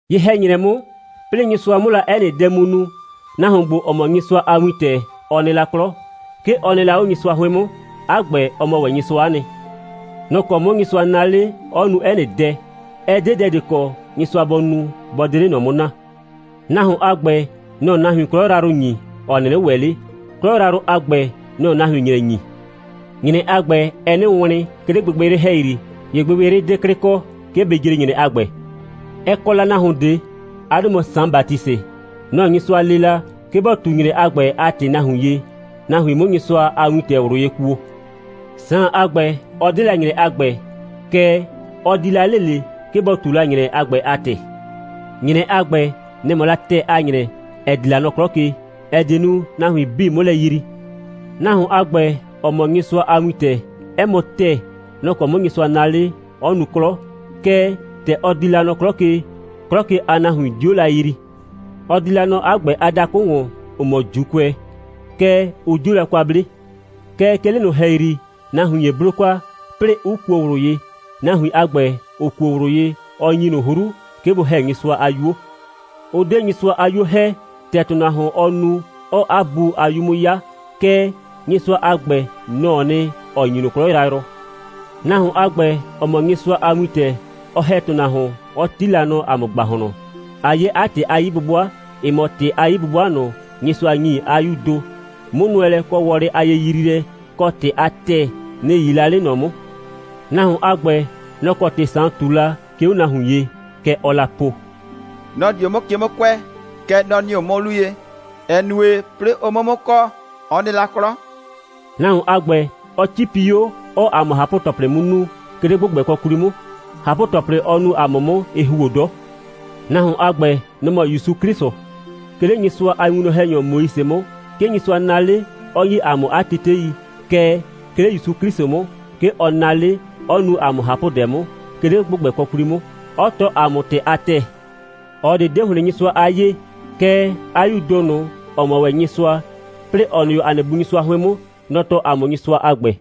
Ye‑hɛ‑nyrɛ 'mʋ, 'plɩɩ Nyɩsʋa 'mʋ la 'ɛ nɩ dɛ mu nu, nahuon ‑gbo, ‑ɔ mɔ Nyɩsʋa a Wintɛ, ɔ nɩ la 'klɔ. 'Ke ɔ nɩ la 'o Nyɩsʋa 'hʋɩn 'mʋ. 'A ‑gbɛ, ɔ mɔ ‑wɛ Nyɩsʋa'a nɩ. Nɔ‑ kɔ 'mʋ Nyɩsʋa naa 'le, 'ɔ nu 'ɛ nɩ dɛ. Ɛ 'de dɛ ꞊de kɔ, Nyɩsʋa bɔ nu, bɔ 'de 'le ꞊nɔ 'mʋ naa. Nahuon a ‑gbɛ, nɔ‑ɔ nahuin 'klɔ yrayrʋ ‑nyi, ‑ɔ 'nɩnɩ ‑wɛ 'le. 'Klɔ yrayrʋ a ‑gbɛ, nɔ‑ɔ nahuin ‑nyrɛ ‑nyi. ‑Nyrɛ a ‑gbɛ, ɛɛ 'nɩ wlɩn, 'ke 'le gbɩgbɩyrɩ ‑hɛyri, ‑ye gbɩgbɩyrɩ 'de 'klɩ kɔ, 'ke bɩ jre ‑nyrɛ a ‑gbɛ. Ɛ kɔ la nahuon ꞊de. 'A 'dʋ mɔ Saan Batisɩ. Nɔ‑ Nyɩsʋa lee la, 'ke bɔ ꞊tu ‑nyrɛ a ‑gbɛ a ‑tɩ nahuin ye, nahuin 'mʋ Nyɩsʋa a Wintɛ ꞊wlʋ ye kuo. Saan a ‑gbɛ, ɔ 'de la ‑nyrɛ a ‑gbɛ, kɛɛ, ɔ di la 'le ꞊le, 'ke bɔ ꞊tu la ‑nyrɛ a ‑gbɛ a ‑tɩ. ‑Nyrɛ a ‑gbɛ, nɛ‑ mɔ la ‑tɛɛ a ‑nyrɛ, ‑ɛ di la nɔ 'klɔ ke, ‑ɛ die nu, nahuin 'bii 'mʋ lɛ yrii. Nahuon a ‑gbɛ, ‑ɔ mɔ Nyɩsʋa a Wintɛ, 'ɛ mɔ ‑tɛɛ, nɔ‑ kɔ 'mʋ Nyɩsʋa naa 'le, 'ɔ nu 'klɔ, kɛɛ, ‑tɛ ɔ di la nɔ 'klɔ ke, 'klɔ ke a nahuin 'dio la yrii. Ɔ di la nɔ 'a ‑gbɛ a dakʋ ‑wɔn, ‑ʋ mɔ ‑Juukʋɛ, kɛɛ, ʋ 'dio la kwa 'ble. Kɛɛ, 'ke 'le ꞊nʋ ‑hɛyri, nahuin ‑ye 'blo kwa, 'plɩɩ 'ʋ kuo ꞊wlʋ ye. Nahuin a ‑gbɛ, ‑ʋ kuo ꞊wlʋ ye, ɔ ‑nyi ꞊nʋ 'hru, 'ke bʋ ‑hɛ Nyɩsʋa a 'yuo. Ʋ 'de Nyɩsʋa a 'yuo ‑hɛ, ‑tɛ ‑tʋnahuon, ɔɔ nu, 'ɔɔ 'a bu a 'yu 'mʋ 'ya. Kɛɛ, Nyɩsʋa a ‑gbɛ, nɔ‑ɔ nɩ, ‑ɔ ‑nyi ꞊nʋ 'klɔ yrayrʋ. Nahuon a ‑gbɛ, ‑ɔ mɔ Nyɩsʋa a Wintɛ, ɔ ‑hɛ ‑tʋnahuon, 'ɔ 'ti la nɔ ‑a mʋ ‑gbahlɔn, ꞊a 'ye 'a ‑tɩ a 'yi'bʋbʋa, ‑ɛ mɔ ‑tɩ a 'yi'bʋbʋa ꞊nʋ, Nyɩsʋa ‑nyi 'a 'Yuu ‑do. 'Mʋnʋɛlɛ kɔ wɔlɩ a yeyriilɛ, kɔ ‑tɩ a ‑tɛɛ, nɩ‑ 'yii la 'le ꞊nɔ 'mʋ. Nahuon a ‑gbɛ, nɔ‑ kɔ ‑tɩ Saan ꞊tu la 'ke 'o nahuin ye. Kɛ ɔɔ la po: «Nɔ‑ di 'o 'mʋ ke 'mʋ kʋɛ, kɛɛ, nɔ‑ nɩ 'o 'mʋ 'lu ye, ‑ɛ nue, 'plɩɩ ʋ 'mʋ 'mʋ kɔ, ɔ nɩ la 'klɔ.» Nahuon a ‑gbɛ, ɔ 'cipi 'o, 'ɔɔ ‑a mʋ ꞊hapʋ‑tɔplɩ 'mʋ nu, 'ke 'le ‑gbʋgbɛkɔ 'kwli 'mʋ. ꞊Hapʋ‑tɔplɩ, ɔ nu ‑a mʋ 'mʋ, ɩ ‑huo 'dɔ. Nahuon a ‑gbɛ, nɔ‑ mɔ ‑Yusu 'Klɩsʋ. 'Ke 'le Nyɩsʋa a winwlɔn‑hɛnyɔ Moise 'mʋ, 'ke Nyɩsʋa naa 'le, 'ɔ ‑nyi ‑a mʋ 'a tetei, kɛɛ, 'ke 'le ‑Yusu 'Klɩsʋ 'mʋ, 'ke ɔ naa 'le, 'ɔ nu ‑a mʋ ꞊hapʋdɛ 'mʋ, 'ke 'le ‑gbʋgbɛkɔ 'kwli 'mʋ, 'ɔ tɔɔ ‑a mʋ ‑tɩ a ‑tɛɛ. ꞊Ɔ ꞊de 'de ‑hlɩn Nyɩsʋa a 'yee. Kɛɛ, 'a 'Yuu ‑do ꞊nʋ, ‑ɔ mɔ ‑wɛ Nyɩsʋa, 'plɩɩ ‑ɔ nɩ 'o ‑a nɩ Bu Nyɩsʋa 'hʋɩn 'mʋ, nɔ‑ tɔɔ ‑a mʋ Nyɩsʋa a ‑gbɛ.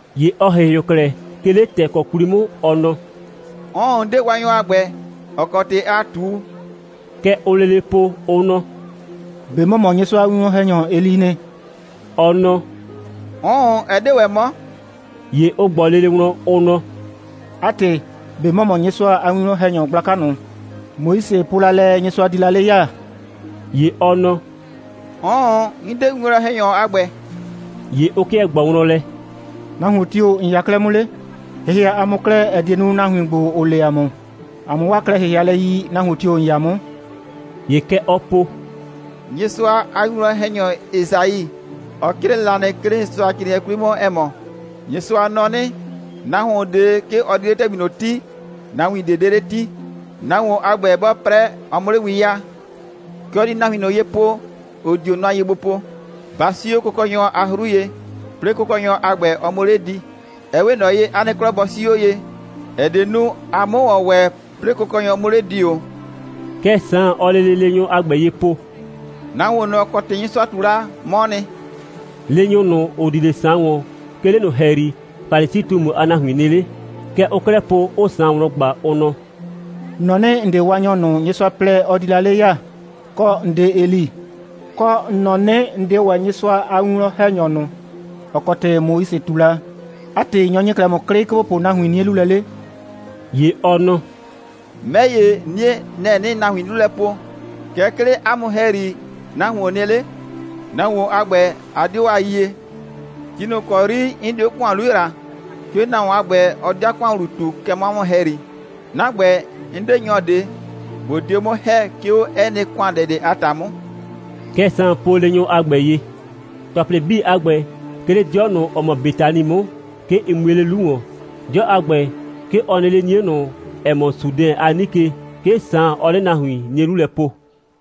‑Ye ɔ ‑hɩhɩʋ klɛ, 'ke 'le ‑tɛɛkɔ 'kwli 'mʋ, ɔ nɔ: «'Ʋʋn, 'n 'de Waanyɔ a ‑gbɛ, ‑ɔ kɔ ‑tɩ aa ꞊tu.» Kɛ ʋʋ lele po, ʋ nɔ: «꞊Be ‑mɔ mɔ Nyɩsʋa a winwlɔn‑hɛnyɔ Eli'i nɩ?» Ɔ nɔ: «'Ʋʋn, ɛ 'de ‑wɛ 'mɔ.» ‑Ye ʋ ꞊gbɔ lele wlɔn, ʋ nɔ: «'A ‑tɩ, ꞊be ‑mɔ mɔ Nyɩsʋa a winwlɔn‑hɛnyɔ gblaka ꞊nʋ, Moise po la lɛ, Nyɩsʋa di la 'le ya?» ‑Ye ɔ nɔ: «'Ʋʋn, 'n 'de winwlɔn‑hɛnyɔ a ‑gbɛ.» ‑Ye ʋ 'kɩɛ ꞊gbɔɔ wlɔn lɛ: «Nahuon tio‑ ‑n 'ya 'klɛɛ 'mʋ 'le? ‑Hɩhɩa ‑a mʋ klɛ, ‑ɛ die nu, nahuin ‑gbo, ‑ʋ lee ‑a mʋ, ‑a 'mʋ 'waa klɛ‑hɩhɩalɛ yi, nahuon tio‑ ‑n 'ya 'mʋ.» ‑Ye kɛ ɔɔ po: «Nyɩsʋa a winwlɔn‑hɛnyɔ Esai, ɔ 'crɩɛ la nɩ, 'ke 'le Nyɩsʋacrɩɩnɩɛ 'kwli 'mʋ, ‑ɛ mɔ: Nyɩsʋa nɔ 'nɩ: Nahuon ꞊de, 'ke ɔ di 'le ‑tɛgbi ꞊nʋ 'ti, nahuin ꞊de 'de 'le 'ti. Nahuon a ‑gbɛ, 'bɔɔ 'prɛ, ɔ 'mʋ 'le win 'yaa. Kɛ ɔ di nahuin ꞊nʋ ye po, ‑ʋ dio nʋa ye gbo po: Ba 'sii 'o Kʋkɔnyɔ a 'hru ye, 'plɩɩ Kʋkɔnyɔ a ‑gbɛ, ɔ 'mʋ 'le di. Ɛ 'we ꞊nɔ ye, 'a nɩ 'klɔ bɔ 'sii 'o ye, ‑ɛ die nu, a 'mʋ ‑wɔn ‑wɛ, 'plɩɩ Kʋkɔnyɔ 'mʋ 'le di ‑o.» Kɛ Saan, ɔɔ lele leenyʋ a ‑gbɛ ye po: «Nahuon ꞊nʋ, ‑ɔ kɔ ‑tɩ Nyɩsʋa ꞊tu la, 'mɔɔ nɩ.» Leenyʋ ꞊nʋ, ‑ʋ di 'le Saan ‑wɔn, 'ke 'le ꞊nʋ ‑hɛyri Falisi꞊tumu a nahuin nɩ 'le. Kɛ ʋʋ 'klɛɛ po, 'ʋʋ Saan wlɔn ꞊gba, ʋ nɔ: «‑N nɔ 'nɩ, ‑n 'de Waanyɔ ꞊nʋ, Nyɩsʋa plɛ, ɔ di la 'le ya, kɔ, ‑n 'de Eli, kɔ, ‑n nɔ 'nɩ, ‑n 'de ‑wɛ Nyɩsʋa a winwlɔn‑hɛnyɔ ꞊nʋ, ‑ɔ kɔ ‑tɩ Moise ꞊tu la. 'A ‑tɩ, nyɔ‑ ‑nyi 'klɛɛ ‑mʋ 'klɩ, 'ke ‑bo po nahuin 'nie 'lu lɛ 'le?» ‑Ye ɔ nɔ: «'Mɛ ‑ye, 'nie, nɛ‑ 'nɩɩ nahuin 'lu lɛ po, kɛɛ, 'ke 'le 'a mʋ ‑hɛyri, nahuon nɩ 'le. Nahuon a ‑gbɛ, a 'dio a yie. Ti ꞊nʋ ‑kɔ 'yri 'n di 'o ‑kʋan 'lu ‑yra, 'ke nahuon a ‑gbɛ, ɔ di 'a ‑kʋan ‑wlu ꞊tu, kɛ nɔ 'a mʋ ‑hɛyri. 'Na ‑gbɛ, 'n 'de nyɔ ꞊de, ꞊bo dio 'mʋ ‑hɛ, 'ke 'o 'ɛ nɩ ‑kʋandɛ ꞊de a ‑ta 'mʋ.» Kɛ Saan po leenyʋ a ‑gbɛ ye. ‑Tɔplɩ 'bii a ‑gbɛ, 'ke 'le 'dɩɔ ꞊nʋ, ‑ɔ mɔ Betani 'mʋ, 'ke ɩ mue 'le 'lu ‑wɔn. 'Dɩɔ a ‑gbɛ, 'ke ɔ nɩ 'le 'nie ꞊nʋ, ‑ɛ mɔ Sudɛn a 'nike. 'Ke Saan, ɔɔ 'le nahuin 'nie 'lu lɛ po.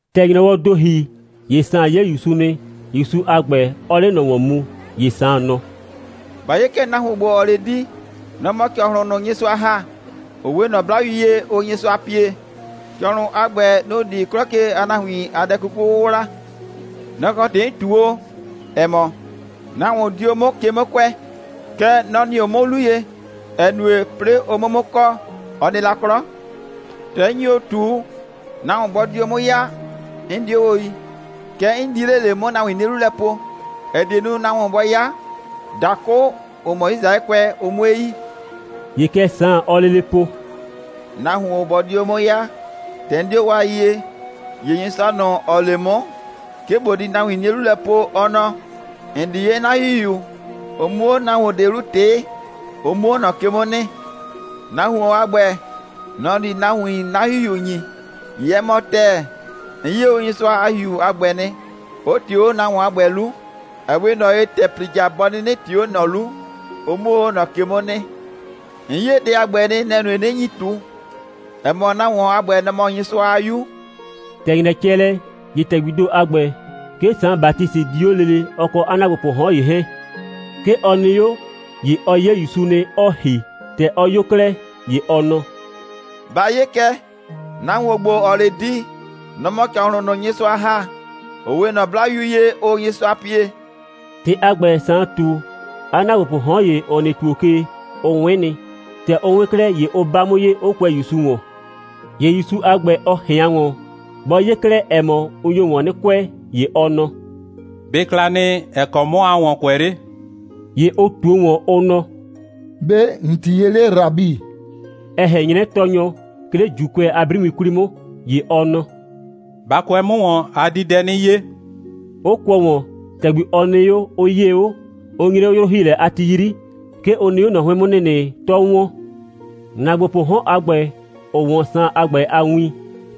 ‑Tɛ ‑nyrɔwɔɔ ‑do ‑hi, ‑ye Saan 'ye ‑Yusu nɩ, ‑Yusu a ‑gbɛ 'ɔɔ 'le ꞊nɔ ‑wɔn mu. ‑Ye Saan nɔ: «Ba 'ye kɛ, nahuon ‑gbo, ‑ɔɔ 'le di, nɔ‑ mɔ ‑cɔhlʋn ꞊nʋ, Nyɩsʋa ‑ha, ‑ʋ 'we ꞊nɔ 'blayu ye, ʋʋ Nyɩsʋa pie. ‑Cɔhlʋn a ‑gbɛ, nʋ‑ di 'klɔ ke a nahuin a dɛ 'kuku 'wʋwla. Nɔ‑ kɔ ‑tɩ 'n ꞊tu o, ‑ɛ mɔ: Nahuon di 'o 'mʋ ke 'mʋ kʋɛ, kɛɛ, nɔ‑ nɩ 'o 'mʋ 'lu ye, ‑ɛ nue, 'plɩɩ ʋ 'mʋ 'mʋ kɔ, ɔ nɩ la 'klɔ. ‑Tɛ 'n nyi o ꞊tu, nahuon bɔ di o 'mʋ 'ya, 'n 'dio o yi. Kɛɛ, 'n di 'le ꞊le, 'mʋ nahuin 'nie 'lu lɛ po, ‑ɛ die nu, nahuon bɔ 'ya, dakʋ, ‑ʋ mɔ Yisraɛkʋɛ, ʋ 'mue yi.» ‑Ye kɛ Saan, ɔɔ lele po: «Nahuon bɔ di o 'mʋ 'ya, ‑tɛ 'n 'dio o a yie, ‑ye Nyɩsʋa ꞊nʋ, ‑ɔ lee 'mʋ, 'ke ꞊bo di nahuin 'nie 'lu lɛ po, ɔ nɔ: ‑N di 'ye 'na ‑Hihiu, ʋ 'mʋ 'o nahuon ꞊de 'lu ꞊tɩɩ, ʋ 'mʋ 'o ꞊nɔ ke 'mʋ nɩ. Nahuon a ‑gbɛ, nɔ‑ di nahuin 'na ‑Hihiu ‑nyi. ‑Ye 'ɛ mɔ ‑tɛɛ, 'n 'ye o Nyɩsʋa a ‑Hihiu a ‑gbɛ nɩ, 'ʋ ꞊tɩɩ o 'o nahuon a ‑gbɛ 'lu, ‑ɛ 'we ꞊nɔ ye, ‑tɛ ‑plija, bɔ 'nɩnɩ ꞊tɩɩ o 'o ꞊nɔ 'lu, ʋ 'mʋ o 'o ꞊nɔ ke 'mʋ nɩ. 'N 'ye dɛ a ‑gbɛ nɩ, nɛ‑ nue, 'nɩ nyi ꞊tu, ‑ɛ mɔ, nahuon a ‑gbɛ, nɔ‑ mɔ Nyɩsʋa a 'Yu.» ‑Tɛ ‑nyrɛ cɛ lɛ, ‑ye ‑tɛgbii ‑do a ‑gbɛ, 'ke Saan Batisɩ di 'o lele, ɔ kɔ 'a ‑naagbopʋʋ 'hɔn ‑ye 'hɛɛn. 'Ke ɔ nɩ 'o, ‑ye ɔ 'ye ‑Yusu nɩ, 'ɔɔ ‑hi. ‑Tɛ ɔ 'yo 'klɛɛ, ‑ye ɔ nɔ: «Ba 'ye kɛ, nahuon ‑gbo, ‑ɔɔ 'le di, nɔ‑ mɔ ‑cɔhlʋn ꞊nʋ, Nyɩsʋa ‑ha, ‑ʋ 'we ꞊nɔ 'blayu ye, ʋʋ Nyɩsʋa pie.» ‑Tɩ a ‑gbɛ, Saan ꞊tu, 'a ‑naagbopʋʋ 'hɔn ‑ye, ‑ʋ nɩ ‑tuo ke, ʋ 'wɩn nɩ. ‑Tɛ ʋ 'wɩn 'klɛɛ, ‑ye ʋ 'ba 'mʋ ye, 'ʋ kʋɛ ‑Yusu ‑wɔn. ‑Ye ‑Yusu a ‑gbɛ, ɔ ꞊hɩan ‑wɔn. Bɔ 'ye 'klɛɛ, ‑ɛ mɔ, ʋ nyo ‑wɔn 'nɩ kʋɛ, ‑ye ɔ nɔ: «꞊Be ɩ kla nɩ, ‑ɛ kɔ 'mɔ aa ‑wɔn kʋɛ 'le?» ‑Ye ʋ ꞊tuo ‑wɔn, ʋ nɔ: «‑Be' ‑n 'tii ye 'le, Rabi?» ‑ɛ ꞊hɛn 'nyrɛ Tɔɔnyɔ, 'ke 'le ‑Juukʋɛ a 'briwin 'kwli 'mʋ. ‑Ye ɔ nɔ: «Ba kʋɛ 'mʋ ‑wɔn, a di dɛ 'nɩ 'ye,» 'ʋ kʋɔ ‑wɔn, ‑tɛgbi ɔ nɩ 'o, 'ʋ 'yee 'o. Ʋ nyre 'o 'yrʋ‑hiilɛ a ti 'yri. 'Ke ʋ nɩ 'o ꞊nɔ 'hʋɩn 'mʋ ‑nɩnɩ, 'tɔ ‑wɔn. ‑Naagbopʋʋ 'hɔn a ‑gbɛ, ‑ʋ 'wɔn Saan a ‑gbɛ a win,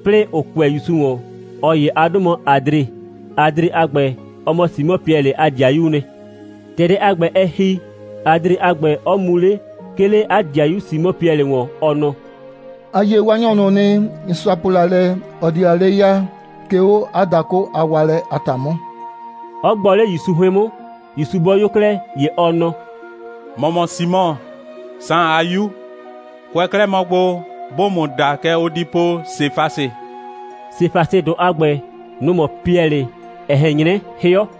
'plɩɩ ‑ʋ kʋɛ ‑Yusu ‑wɔn, ꞊ɔ ‑ye a 'dʋ mɔ Adre. Adre a ‑gbɛ, ɔ mɔ Simɔ Piɛlɩ a ‑dɩayuu nɩ. ‑Tɛ dɛ a ‑gbɛ, ɛ ‑hi, Adre a ‑gbɛ 'ɔ mu 'le, 'ke 'le 'a ‑dɩayu Simɔ Piɛlɩ ‑wɔn, ɔ nɔ: «‑A 'ye Waanyɔ ꞊nʋ nɩ, Nyɩsʋa po la lɛ, ɔ di la 'le ya, 'ke 'o 'a dakʋ a waalɛ a ‑ta 'mʋ,» 'ɔ gbɔ 'le ‑Yusu 'hʋɩn 'mʋ. ‑Yusu bɔ 'yo 'klɛɛ, ‑ye ɔ nɔ: «‑Mɔ mɔ Simɔ, Saan a 'yu. Kʋɛ 'klɛɛ mɔ gbo, 'bʋʋ ‑mʋ da, kɛ ʋ di po: Sefasɩ.» Sefasɩdʋ a ‑gbɛ, nʋ‑ mɔ Piɛlɩ, ‑ɛ ꞊hɛn 'nyrɛ 'hɩɔ.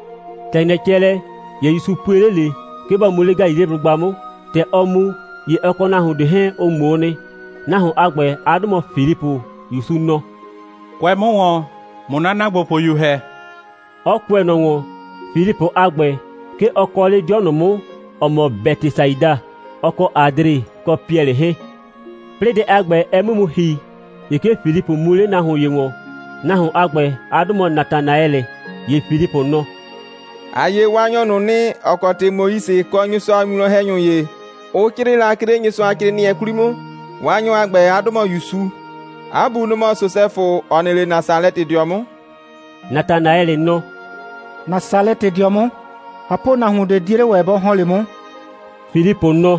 ‑Tɛ ‑nyrɛ cɛ lɛ, ‑ye ‑Yusu pue 'le ꞊le, 'ke bɔ mu 'le Galileblʋgba 'mʋ. ‑Tɛ ɔɔ mu, ‑ye ɔ kɔ nahuon ꞊de 'hɛɛn, ʋ ꞊ŋmoo nɩ. Nahuon a ‑gbɛ, 'a 'dʋ mɔ Filipʋ. ‑Yusu nɔ: «Kʋɛ 'mʋ ‑wɔn, ꞊mʋ 'na ‑naagbopʋyu ‑hɛ,» 'ɔ kʋɛ ꞊nɔ ‑wɔn. Filipʋ a ‑gbɛ, 'ke ɔ kɔ 'le 'dɩɔ ꞊nʋ 'mʋ, ‑ɔ mɔ Bɛtɩsaida, ɔ kɔ Adre kɔ Piɛlɩ 'hɛɛn. 'Plɩɩ dɛ a ‑gbɛ, ɛ 'mʋ mu ‑hi, ‑ye 'ke Filipʋ mu 'le nahuon ‑ye ‑wɔn. Nahuon a ‑gbɛ, 'a 'dʋ mɔ Natanaɛlɩ. ‑Ye Filipʋ nɔ: «‑A 'ye Waanyɔ ꞊nʋ nɩ, ‑ɔ kɔ ‑tɩ Moise kɔ Nyɩsʋa a winwlɔn‑hɛnyʋ ‑ye, ʋ 'crɩɩ la, 'ke 'le Nyɩsʋacrɩɩnɩɛ 'kwli 'mʋ. Waanyɔ a ‑gbɛ, 'a 'dʋ mɔ ‑Yusu. 'A bu, nɔ‑ mɔ Sosɛfʋ, ‑ɔ nɩ 'le Nasalɛtɩdɩɔ 'mʋ.» Natanaɛlɩ nɔ: «Nasalɛtɩdɩɔ 'mʋ, ꞊hapʋnahuon ꞊de 'die 'le ‑wɛ bɔ ‑hɔn 'le 'mʋ.» Filipʋ nɔ: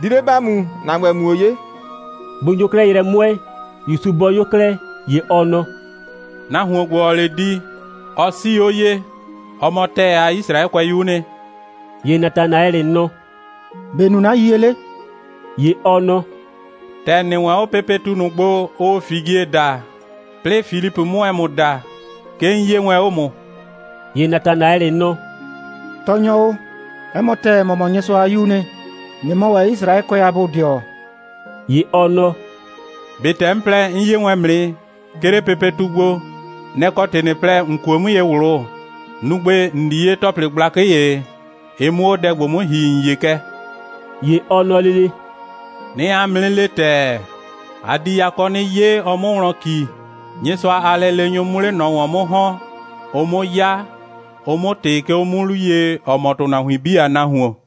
«Di 'le ‑ba mu, ‑na ‑gbɛ, ꞊muo 'ye.» Bʋ nyo 'klɛɛ yrɛ 'mʋɛɛ, ‑Yusu bɔ 'yo 'klɛɛ, ‑ye ɔ nɔ: «Nahuon ‑gbo, ‑ɔɔ 'le di, ɔ 'sii 'o ye. Ɔ mɔ ‑tɛɛ a Yisraɛkʋɛyuu nɩ.» ‑Ye Natanaɛlɩ nɔ: «‑Be' ‑n nu 'na yiyie 'le?» ‑Ye ɔ nɔ: «‑Tɛ ‑n nɩ wɛn 'o pepetu ꞊nʋ gbo, ʋʋ figie daa, 'plɩɩ Filipʋ 'mʋ wɛn ‑mʋ da, 'ke 'n 'yee wɛn 'o ‑mʋ.» ‑Ye Natanaɛlɩ nɔ: «Tɔɔnyɔ o, 'ɛ mɔ ‑tɛɛ, ‑mɔ mɔ Nyɩsʋa a 'Yuu nɩ, ꞊nɩ mɔ ‑wɛ Yisraɛkʋɛ a bodɩɔ.» ‑Ye ɔ nɔ: «꞊Be ‑tɛ 'n po lɛ, 'n 'ye wɛn ‑mʋ nɩ, 'ke 'le pepetu gbo, nɛ‑ kɔ ‑tɩ ꞊nɩ plɛ, ‑n kuo 'mʋ ye ꞊wlʋ? Nu gbe, ‑n di 'ye ‑tɔplɩ gblakɩ ‑ye, ɩ 'mʋ 'o dɛ ‑gbo 'mʋ ‑hi, ‑n 'ye kɛ.» ‑Ye ɔ nɔ lele: «'Nɩɩ 'a mʋ 'nɩ le ‑tɛɛ, a di yakɔ 'nɩ 'ye, ɔ 'mʋ wlɔn ‑ki, Nyɩsʋa a lɛleenyʋ 'mʋ 'le ꞊nɔ ‑wɔn 'mʋ ‑hɔn, ʋ 'mʋ 'ya, ʋ 'mʋ ꞊tɩ 'ke 'o 'mʋ 'lu ye, ‑ɔ mɔ ‑tʋnahuin 'bii a Nahuon.»